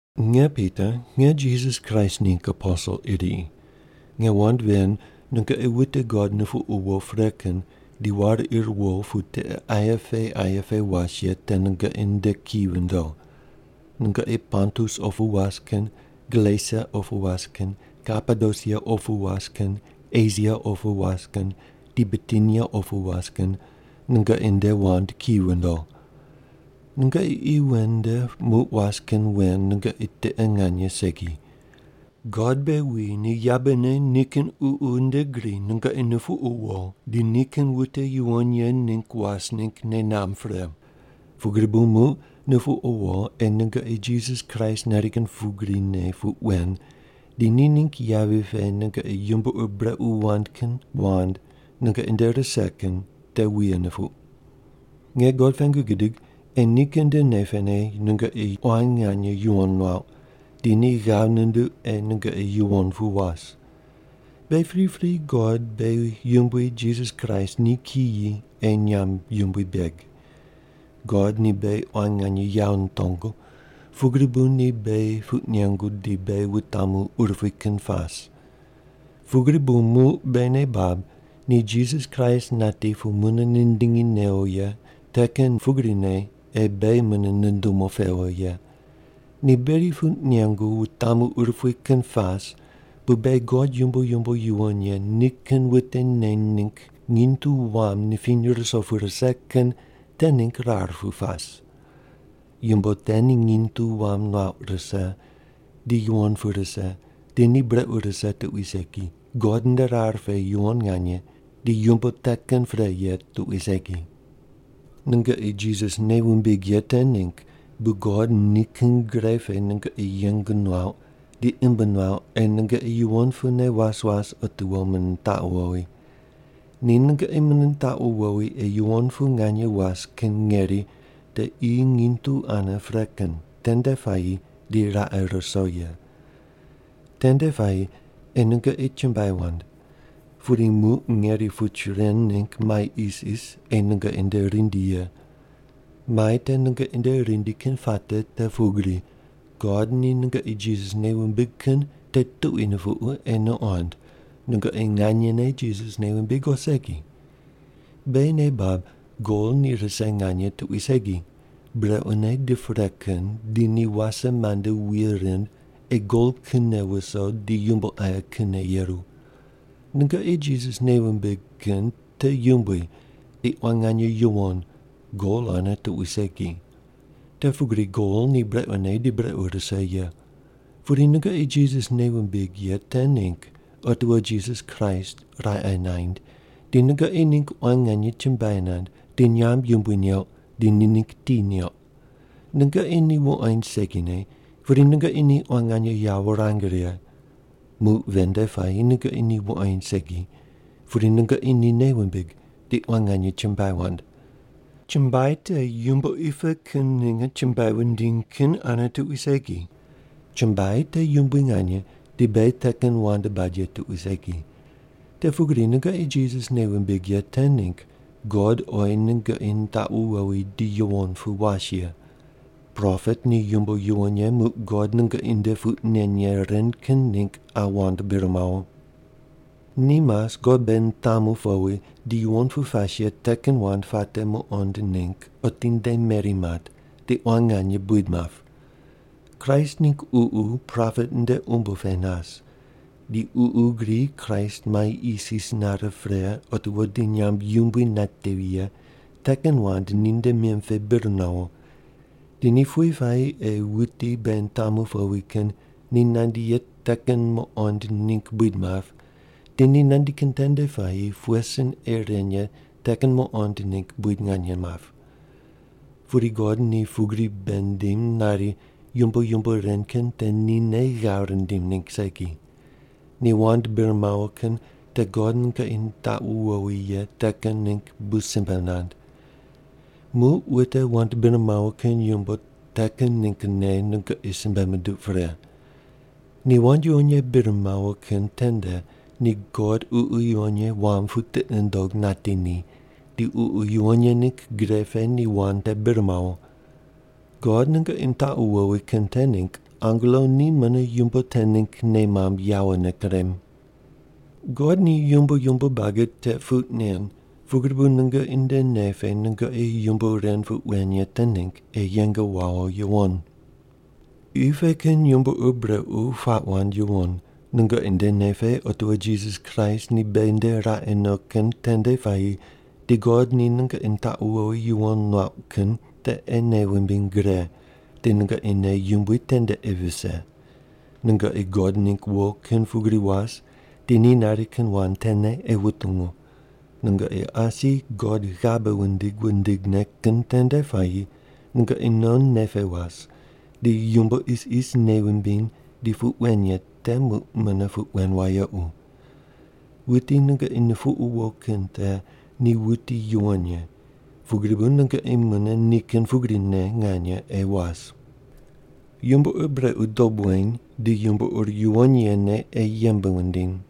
Nge Pita, nge Jisas Kraist ningg aposel iri. Nge wand ven nungoqi wute God nupuqu wo pre kin di war ir wo pu tiqe aye pe aye pe was ye te nungoqi nde ki vindo. Nungoqi Pontus opu was kin, Galesia opu was kin, Kapadosia opu was kin, Esia opu was kin, di Bitinia opu was kin, nungoqi nde wand ki vindo. Nungoqi qi wen nde muq was kin wen nungoqi tiqe nganye segi. God beghi wuyi ni yabene nikin Ququ nde gri nungoqi nupuqu wo di nikin wute yuwon ye ningg was ningg nei namb pre. Pugri bu muq nupuqu wo ei nungoqi Jisas Kraist nari kin pugrine puq wen, di ni ningg yavi pe nungoqi yumbo ur brequ wand kin wand nungoqi nde rise kin te wuye nupuq. Nge God pengu gidig ei nikin nde nei pene nungoqi quan nganye yuwon nuauq, di ni ghav nunduq ei nungoqi yuwon pu was. Beghi pripri God beghi Yumbui Jisas Kraist ni kiyi ei nyamb yumbui beg. God ni beghi quan nganye yawo nitongu, pugri bu ni beghi puq nengu di beghi wutamu urupui kin pas. Pugri bu muq beghi nei bab ni Jisas Kraist nati pu mune nindingi newo ye te kin pugrine ei beghi mune nundumu pewo ye. Ni beghi puq nengu wutamu urupui kin pas bu beghi God yumbo yumbo yuwon ye nikin wute neny ningg nginy tu wam nipiny ruso pu rise kin te ningg rar pu pas. Yumbo te ni nginy tu wam nuauq rise, di yuwon pu rise, di ni brequ rise tuqui segi, God nde rar pe yuwon nganye, di yumbo te kin pre ye tuqui segi. Nungoqi Jisas nei wumbig ye te ningg bu God nikin gre pe nungoqi yeng nuauq di imb nuauq ei nungoqi yuwon pune was was otiwo mune nitaqu wowi. Ni nungoqi mune nitaqu wowi ei yuwon pu nganye was kin ngeri te qi nginy tu ane pre kin tende puayi di raqe ruso ye. Tende puayi ei nungoqi chumbuai wand. Pudi muq ngeri puch ren ningg mai isis ei nungoqi nde rindi ye. Mai te nungoqi nde rindi kin puate te pugri, God ni nungoqi Jisas nei wumbig kin te tuqui nupuqu ei nuqond, nungoqi nganyene Jisas nei wumbig o segi. Beghi nei bab gol ni rise nganye tuqui segi, brequne di pre kin te ni wase mande wuye rind ei gol kinne wuso di yumbo aye kinne yeru. Nungoqi Jisas nei wumbig kin te yumbui di quan nganye yuwon, gol ane tuqui segi. Te pugri gol ni brequne di brequ rise ye. Pudi nungoqi Jisas nei wumbig ye te ningg otiwo Jisas Kraist raqe naind, di nungoqi ningg quan nganye chumbuai nand, di nyamb yumbui neuq, di ni ningg ti neuq. Nungoqi ni wuqoind segine, pudi nungoqi ni quan nganye yawo wurang righe. Muq ven nde puayi nungoqi ni wuqoind segi, pudi nungoqi ni nei wumbig, di quan nganye chumbuai wand. Chumbuai te yumbo qi pe kin ninge chumbuai wundiny kin ane tuqui segi. Chumbuai te yumbui nganye di beghi te kin wand bad ye tuqui segi. Te pugri nungoqi Jisas nei wumbig ye te ningg God oyi nungoqi nitaqu wowi di yuwon pu was ye. Propet ni yumbo yuwon ye muq God nungoqi nde puq nen ye ren kin ningg qa wand bir mawo. Ni mas God beghi nitamu powi di yuwon pu pas ye te kin wand puate muqond ningg otinde meri mat di quan nganye buid map. Kraist ningg Ququ propet nde umbo pe nas. Di Ququ gri Kraist mai isis nare pre otiwo di nyamb yumbui natevi ye te kin wand ninde mim pe bir nawo. Di ni pughe puayi ei wuti beghi nitamu powi kin ni nandi ye te kin muqond ningg buid map, di ni nandi kin tende puayi pughe sin ei ren ye te kin muqond ningg buid nganye map. Pudi God ni pugri bei nindim nari yumbo yumbo ren kin te nine ghav rindim ningg segi. Ni wand bir mawo kin te God nungoqi nitaqu wowi ye te kin ningg bu simbe mand. Muq wute wand bir mawo kin yumbo te kin ninggne nungoqi simbe munduq pre. Ni wand yuwon ye bir mawo kin tende di God Ququ Yuwon Ye wam pu tiqi nundog nati ni, di Ququ Yuwon Ye ningg gre pe ni wand te bir mawo. God nungoqi nitaqu wowi kin te ningg angelo ni mune yumbo te ningg nei mamb yawone kurem. God ni yumbo yumbo buagi te puq nen pugri bu nungoqi nde nei pe nungoqi yumbo ren puq wen ye te ningg ei yeng wawo yuwon. Qi pe kin yumbo ur brequ puaq wand yuwon. Nungoqi nde nei pe otiwo Jisas Kraist ni beghi nde raqe no kin tende puayi di God ni nungoqi nitaqu wowi yuwon nuauq kin te ei nei wumbiny gre, di nungoqi nei yumbui tende ei vise. Nungoqi God ningg wo kin pugri was di ni nari kin wand tene ei wutungu. Nungoqi asi God ghabe wundig wundigne kin tende puayi nungoqi non nei pe was di yumbo isis nei wumbiny di puq wen ye te muq mune puq wen wayequ. Wuti nungoqi nupuqu wo kin te ni wuti yuwon ye, pugri bu nungoqi mune ni kin pugrine nganye ei was. Yumbo ur brequ dob weny, di yumbo ur yuwon yene ei yembe wundiny.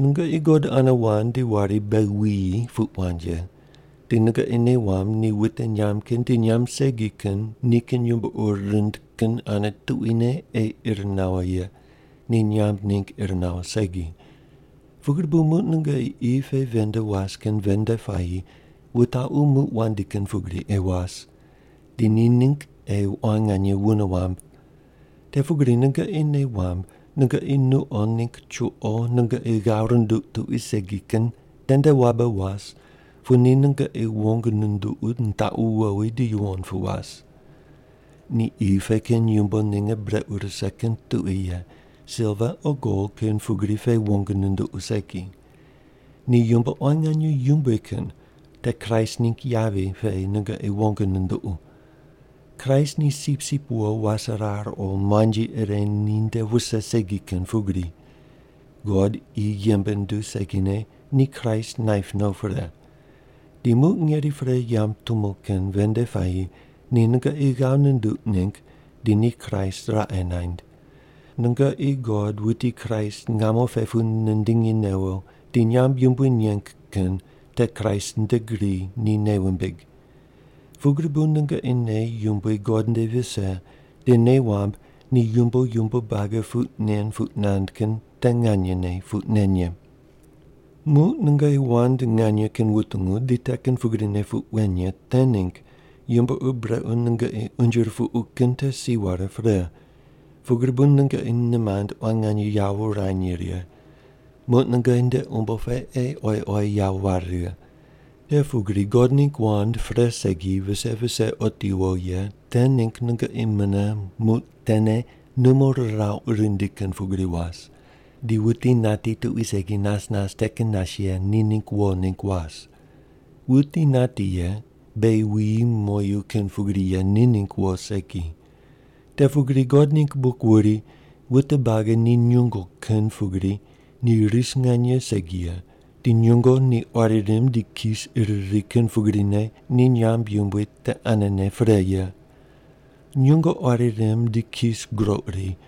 Nungoqi God ane wand di wari, “beghi wuyi” puq wand ye. Di nungoqi nei wamb ni wute nyamb kin di nyamb segi kin nikin yumbo ur rind kin ane tuquine ei ir nawo ye, ni nyamb ningg ir nawo segi. Pugri bu muq nungoqi qi pe ven nde was kin ven nde puayi wutaqu muq wandi kin pugri ei was, di ni ningg ei quan nganye wune wamb. Te pugri nungoqi nei wamb, nungoqi nuqo ningg chuqo nungoqi ghav runduq tuqui segi kin tende wabe was pu ni nungoqi wong nunduqu nitaqu wowi di yuwon pu was. Ni qi pe kin yumbo ninge brequ rise kin tuqui ye, silva o gol kin pugri pe wong nunduqu segi. Ni yumbo quan nganye yumbui kin, te Kraist ningg yavi pe nungoqi wong nunduqu. Kraist ni sipsip wo waserar o muanji ire ninde wuse segi kin pugri. God qi yembe nunduw segine ni Kraist naip no pre. Di muq ngeri pre yamb tumo kin ven nde puayi ni nungoqi ghav nunduq ningg di ni Kraist raqe naind. Nungoqi God wuti Kraist ngamo pe pu nindingi newo di nyamb yumbui neng kin te Kraist nde gri ni nei wumbig. Pugri bu nungoqi nei yumbui God nde vise di nei wamb ni yumbo yumbo buagi puq nen puq nand kin te nganye puq nen ye. Muq nungoqi wand nganye kin wutungu di te kin pugrine puq wen ye te ningg yumbo ur brequ nungoqi unje rupuqu kin te si ware pre. Pugri bu nungoqi nimand quan nganye yawo wurany righe. Muq nungoqi nde umbo pe ei oyi oyi yawo ware righe. Te pugri God ningg wand pre segi vise vise otiwo ye te ningg nungoqi mune muq tene numo rirauq rindi kin pugri was, di wuti nati tuqui segi nas nas te kin nas ye ni ningg wo ningg was. Wuti nati ye, beghi wuyi moyu kin pugri ye ni ningg wo segi. Te pugri God ningg buk wuri, “Wute buagi ni nyungo kin pugri, ni ris nganye segi ye; di nyungo ni quari rimb di kis ir ri kin pugrine ni nyamb yumbui te anene pre ye. Nyungo quari rimb di kis groq ri,